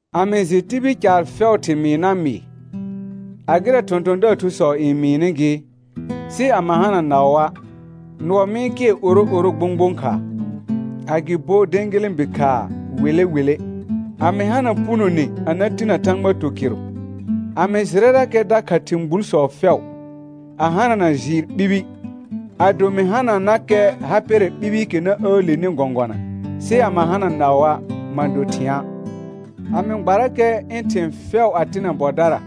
A mɩ jɩ tibil caar fɛʋʋ thɩmɩɩ na mɩɩ, a gɩrɛ thɔ̃thɔ̃daar thusɔ n mɩɩnɩ gɩ, sɩ a ma hana naʋa', nʋɔ mɩ-n kɩɛr oro oro gbõgbõ khaa, agɩbo dẽgelẽbi khaa wele wele. A mɩ hana punone a na tinə Thãgba tukɩrʋ, a mɩ jɩrɛrakɛ dakha thɩ̃ gbulsɔ fɛʋ, a hanana jɩɩr ɓibi, ado mɩ hananakɛ ha pɛrɛ ɓibiikɛ na əəleni gɔ̃gɔna, sɩ a ma hana naʋa', ma do thɩ̃a'. A mɩ gbarakɛ ɩ̃ thɩ̃ fɛʋ a tɩnɛ bɔdara,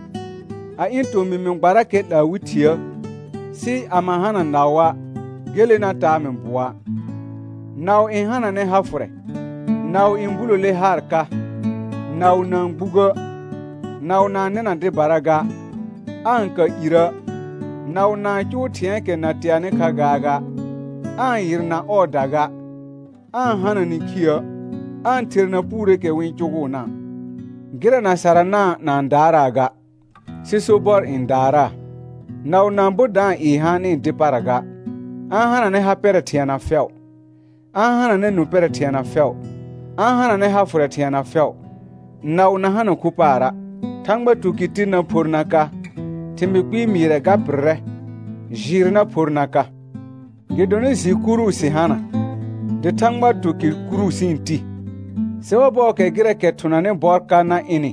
a ɩ̃ tomɩ mɩ gbarakɛ 'laa wɩ thiə, sɩ a ma hana naʋa', gele na taa mɩ bʋɔa'. Naʋ n hananɛ ha fʋrɛ, naʋ n bulole haar ka, naʋ na-n gbugə', naʋ na-n nɩna dɩbara ga, aa-n ka irə', naʋ na-n cʋʋ thɩ̃ɛɛkɛ na teanɩ kha gaaga, aa-n yɩrna ɔɔda ga, aa-n hana nĩkhiə', aa-n therna puureekɛ wɩ-n cʋgʋʋna'; gɩrɛ na sarana' na-n daaraa ga, sɩ sobɔr n daaraa. Naʋ na-n bo da-n ɩɩ haanɩ dɩ para ga, a-n hananɛ ha pɛrɛ thɩɛna fɛʋ, a-n hananɛ nũ pɛrɛ thɩɛna fɛʋ, a-n hananɛ ha fʋrɛ thɩɛna fɛʋ. Naʋ na hana khu paara'. Thãgba tukɩr tir na phor na ka, thɩmɩɩ kpɩɩ mɩɩrɛ ga pɩrrɛ, jɩɩr na phor na ka; gɩdonɩ jɩ kuru sɩ hana, dɩ Thãgba tukɩr kuru sɩ-n ti. Sɩ ɔbɔɔkɛ gɩrɛɛkɛ thʋnanɩ bɔr ka na ɩnɩ,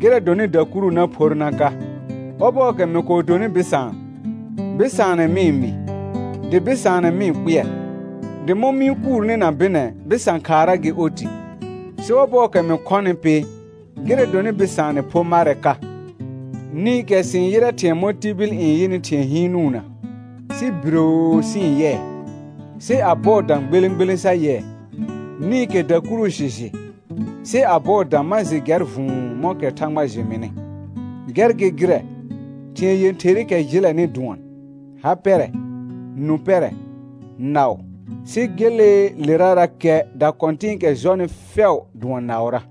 gɩrɛ dɔnɩ dakuru na phor na ka. Ɔbɔɔkɛ mɩ kɔɔ donɩ bɩsaan, bɩsaanɛ mɩ-n mɩɩ, dɩ bɩsaanɛ mɩ-n kpɩɛr, dɩ mɔ̃ mɩ-n kuurni na bɩnɛ, bɩsã khaara gɩ oti. Sɩ ɔbɔɔkɛ mɩ khɔnɩ pɩ, gɩrɛ dɔnɩ bɩsaanɛ pho marɛ ka. Nĩkɛ sɩ-n yɩrɛ ɩhĩɛ mɔ tibil n yɩnɩ thɩ̃ɛ hɩɩnʋna, sɩ biroo sɩ-n yɩɛ, sɩ a bɔɔ dã gbelẽ gbelẽ sa yɩɛ. Nĩkɛ dakuru sɩ jɩ, sɩ a bɔɔ dã ma jɩ gɛr vʋ̃ʋ mɔ̃kɛ Thãgba jɩ mɩnɩ. Gɛr gɩ gɩrɛ, thɩ̃ɛ yẽtherɩkɛ jɩlɛnɩ dʋɔn: Ha pɛrɛ, nũ pɛrɛ, naʋ, sɩ geleelerarakɛ dakɔ̃tɩ̃ɩkɛ jɔnɩ fɛʋ dʋɔn naʋra.